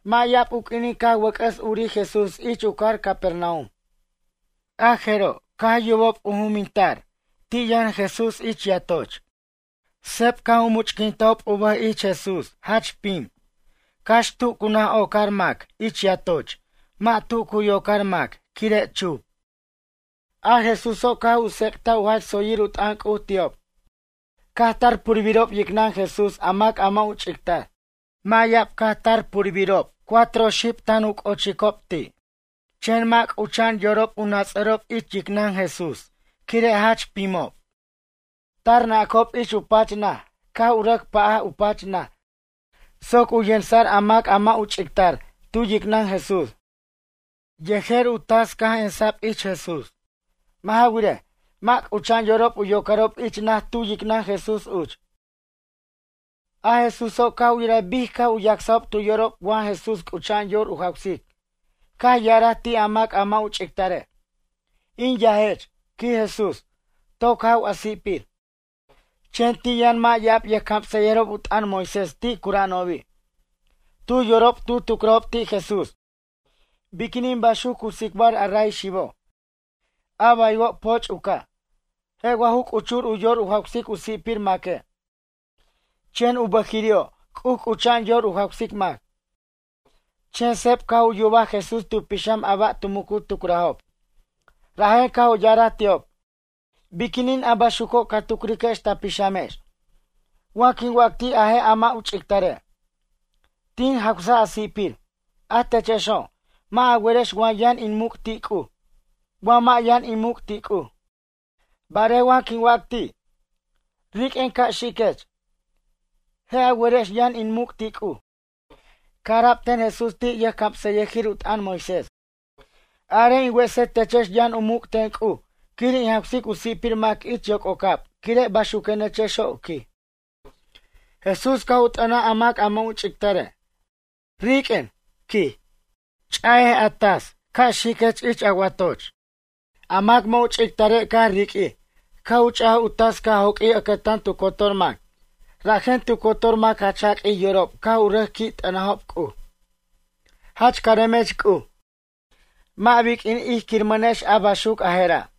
Mʌ' ya'ab u q'uinin caj wʌc'ʌs urij Jesús ich u cajar Capernaum. A jeroj caj yubob u juminta'b, ti' yʌn Jesús ich yatoch. Seb caj u much'quintajob u bʌj ich Jesús jach pim, cax tu cu naj ocar mac ich yatoch mʌ' u p'atar tu cu yocar mac quire' pech. A Jesúso' caj u tsec'taj u jach tsoyir u t'ʌn C'uj ti'ob. Caj tar purbirob yicnʌn Jesús a mac a mʌ' u ch'ictar. Mʌ' ya'ab caj tar purbirob cuatro xib tan u c'ochicob ti'. Chen mʌ' c'ucha'an yorob u nats'arob yicnʌn Jesús quire' a pimo'. Tar nacob ich pach naj, caj u rʌc pa'aj u pach naj soc u yensʌ'r a mac a mʌ' u ch'ictar tu yicnʌn Jesús. Yej u tas caj emsa'b ich Jesús. Mʌ' ja wirej, mʌ' c'ucha'an yorob u yocarob ich naj tu yicnʌn Jesús uch. A Jesúso' caj u yiraj bic caj u yacsob tu yorob wa Jesús c'ucha'an yor u jawsic caj u ya'araj ti' a mac a mʌ' u ch'ictare': ―In yajech ―quij Jesús―, toc jaw a si'pir. Chen ti' yʌn mʌ' ya'ab yʌjcamsʌyʌjirob u t'ʌn Moisés ti' cura'anobi'. Tu yorob tu tucrajob ti' Jesús: “Biquinin baxuc cu tsicbar a ray xibo'? A baywo' poch' u ca'. Je' wa ju ch'uchur u yor u jawsic u si'pir maque', chen u bʌjiri'o' C'uj c'ucha'an yor u jawsic mac?” Chen seb caj u yubaj Jesús tu pixam a ba' tu mucu tucrajob, rajen caj u ya'araj ti'ob: ―Biquinin a baxuco' ca tucriquex ta pixamex? Wa quin wac ti' a je' a mʌ' u ch'ictare': “Tin jawsaj a si'pir”, a techexo', mʌ' a werex wa yʌn in muc' ti' C'uj wa mʌ' yʌn in muc' ti' C'uj. Barej wa quin wac ti': “Riq'uen ca' xiquech”, je' a werex yʌn in muc' ti' C'uj. Caj ara'b ten Jesús ti' yʌjcamsʌyʌjir u t'ʌn Moisés: “Arej in wesej techex yʌn u muc' ten C'uj quir in jawsic u si'pir mac ich yoc'ocab quire' baxuquenechexo', quij.” Jesús caj u t'ʌnaj a mac a mʌ' u ch'ictare': ―Riq'uen ―quij―, ch'aj a tas ca' xiquech ich a watoch. A mac mʌ' u ch'itare' caj riq'uij caj u ch'aj u tas caj joq'uij ʌcʌtan tu cotor mac rajen tu cotor mac jach jaq'uij yorob caj u rʌc qui' t'ʌntajob C'uj: ―Jach caremech C'uj. Mʌ' biq'uin ij quiramʌnex a baxuc a jera'.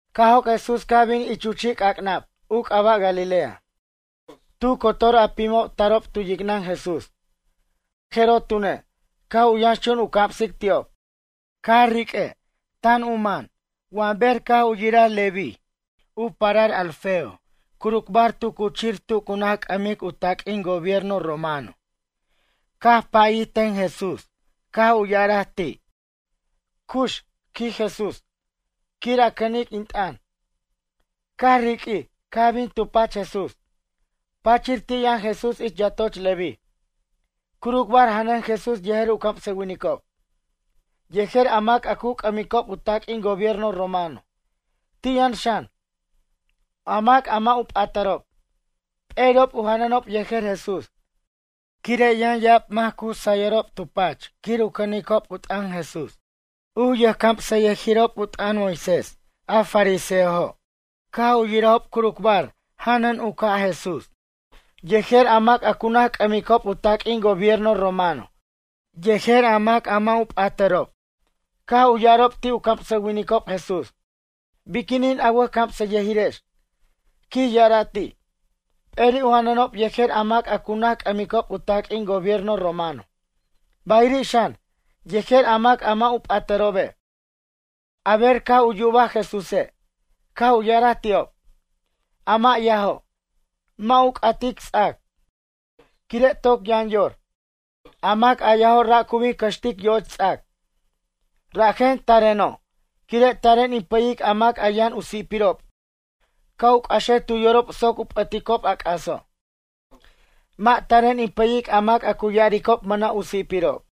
Caj joc' Jesús caj bin ich u chi' c'ac'nab u c'aba' Galilea. Tu cotor a pimo' tarob tu yicnʌn Jesús, a jeroj tune', caj u yʌnxchun u camsic ti'ob. Carique' tan u man wa ber caj u yiraj Leví, u parar Alfeo curucbar tu cuchir tu cu naj c'ʌmic u taq'uin gobierno romano. Caj pʌyir ten Jesús caj u ya'araj ti': ―Cux ―quij Jesús―, quir a cʌnic in t'ʌn. Caj riq'uij, caj bin tu pach Jesús. Pachir ti' yʌn Jesús ich yatoch Leví. Curucbar janʌn Jesús yejer u camsʌwinicob, yejer a mac a cu c'ʌmicob u taq'uin gobierno romano. Ti' yʌn xan, a mac a mʌ' patarob, p'eri'ob u janʌnob yejer Jesús. Quire' yʌn ya'ab mac cu sayob tu pach quir u cʌnicob u t'ʌn Jesús. U camsʌyʌjirob u t'ʌn Moisés a fariseojo' caj u yirajob curucbar janʌn u ca' Jesús yejer a mac a cu naj c'ʌmicob u taq'uin gobierno romano yejer a mac a mʌ' patarob, caj u ya'arob ti' u camsʌwinicob Jesús: ―Biquinin a wʌjcamsʌyʌjirex ―quij ya'araj ti'― p'eri' u janʌnob yejer a mac a cu naj c'ʌmicob u taq'uin u gobierno romano, bayiri' xan, yejer a mac a mʌ' patarobe'? A ber caj u yubaj Jesúse', caj u ya'araj ti'ob: ―A mʌ' yajo', mʌ' u c'atic ts'ac, quire' toc yʌn yor. A mac a yajo' ra' cu bin cʌxtic yo'och ts'ac. Rajen tareno'. Quire' taren in pʌyic a mac a yʌn u si'pirob ca' u c'axej tu yorob soc u p'ʌticob a c'aso'. Mʌ' taren in pʌyic a mac a cu ya'aricob mʌna' u si'pirob.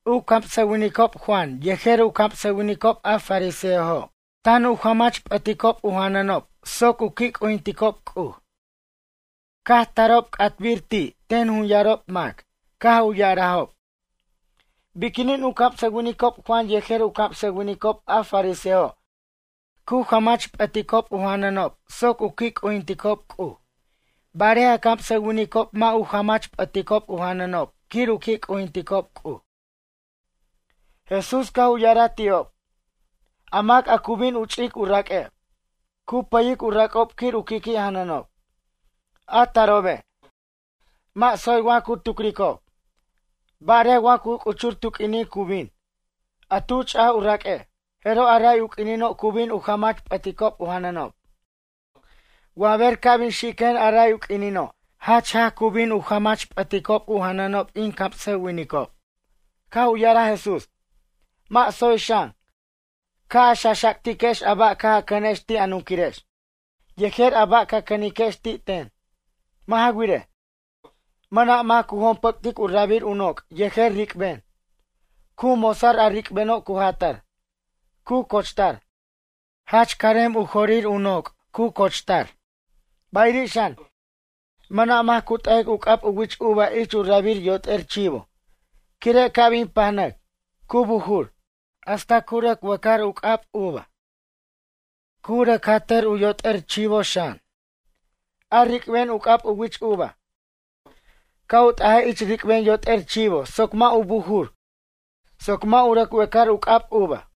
U camsʌwinicob Juan yejer camsʌwinicob a fariseojo' tan u jamach p'ʌticob u janʌnob soc u qui' c'ujinticob C'uj. Caj tarob c'ata'bir ti' ten jun yarob mac caj u ya'arajob: ―Biquinin u camsʌwinicob Juan yejer u camsʌwinicob a farisejo' cu jamach p'ʌticob u janʌnob soc u qui' c'ujinticob C'uj, barej a camsʌwinicob mʌ' u jamach p'ʌticob u janʌnob quir u qui' c'ujinticob C'uj? Jesús caj u ya'araj ti'ob: ―A mac a cu bin u ch'ic u raque', cu pʌyic u rac'ob quir u qui' qui' janʌnob. A tarobe', mʌ' tsoy wa cu tucricob. Barej wa cu c'uchur tu q'uinin cu bin, a tu ch'aj u raq'ue', jeroj a ray u q'uinino' cu bin u jamach p'ʌticob u janʌnob. Wa ber ca' bin xiquen a ray u q'uinino' jach jaj cu bin u jamach p'ʌticob u janʌnob in camsʌwinicob. Caj u ya'araj Jesús: ―Mʌ' tsoy xan, ca' a xaxactiquex a ba' caj a cʌnex ti' a nunquirex yejer a ba' ca cʌniquex ti' ten. Mʌ' ja wirej, mʌna' mac cu jompʌc'tic u rabir u noc' yejer ric'ben. Cu mosar a ric'beno' cu jatar, cu cochtar. Jach carim u jorir u noc' u cochtar. Bayiri' xan, mʌna' mac cu t'ajic u c'ab u wich uva ich u rabir yot'er chivo. Quire' ca' bin pajnʌc, cu bujur, hasta u rʌc wecar u c'ab uva. Cu rʌc jatar u yot'er chivo xan. A ric'ben u c'ab u wich uva, ca' u t'ajej ich ric'ben yot'er chivo soc mʌ' u bujur soc mʌ' u rʌc wecar u c'ab uva.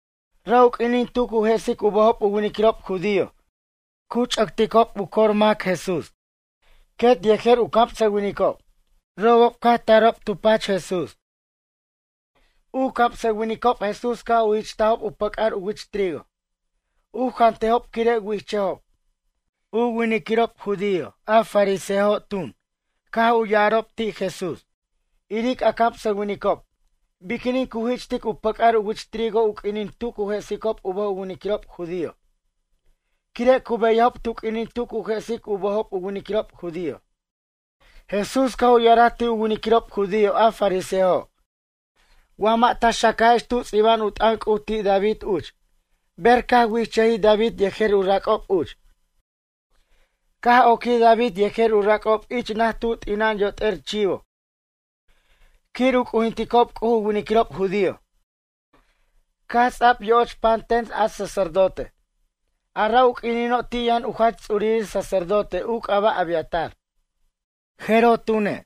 Ra' u q'uinin tu cu jesic u bʌjob u winiquirob judío, cu ch'ʌtob u cor mac Jesús, quet yejer u camsʌwinicob. Robob caj u tarob tu pach Jesús. U camsʌwinicob Jesús caj u jich'tajob u pʌc'ar u wich trigo, u jantejob quire' wichʌjob. A winiquirob judío a fariseojo' tun, caj u ya'arob ti' Jesús: ―Iric a camsʌwinicob. Biquinin cu jich'ticob u pʌc'ar u wich trigo u q'uinin tu cu jesicob u bʌj u winiquirob judío. Quire' cu beyajob tu q'uinin tu cu jesic u bʌjob u winiquirob judío. Jesús caj u ya'araj ti' u winiquirob judío a fariseojo': ―Mʌ' wa ta xacajex tu ts'iba'an u t'ʌn C'uj ti' David uch ber caj wichʌjij David yejer u rac'ob uch? Caj oquij David yejer u rac'ob ich naj tu t'ina'an yot'er chivo quir u c'ujinticob C'uj u winiquirob judío. Caj ts'a'b yo'och pan ten a sacerdote. A ra u q'uinino' ti' yʌn u jach ts'urir sacerdote u c'aba' Abiatar. A jeroj tune',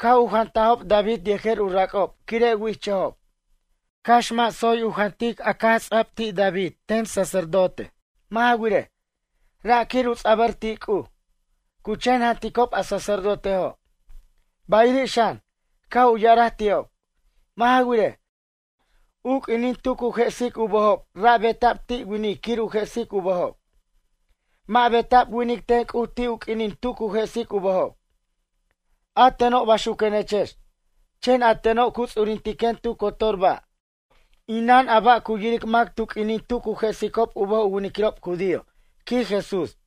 caj u jantajob David yejer u rac'ob quire' wichʌjob, cax mʌ' tsoy u jantic a caj ts'a'b ti' David ten sacerdote. Mʌ' ja wirej, ra' quir u ts'abʌr ti' C'uj, cu chen janticob a sacerdotejo'. Bayiri' xan, caj u ya'araj ti'ob: ―Mʌ' ja wirej, u q'uinin tu cu jesic u bʌjob ra' beta'b ti' winic quir u jesic u bʌjob. Mʌ' beta'b winic ten C'uj ti' u q'uinin tu cu jesic u bʌjob. A teno', baxuquenechex, chen a teno' cu ts'uririntiquen tu cotor ba', inan a ba' cu yiric mac tu q'uinin tu cu jesicob u bʌj u winiquirob judío ―quij Jesús.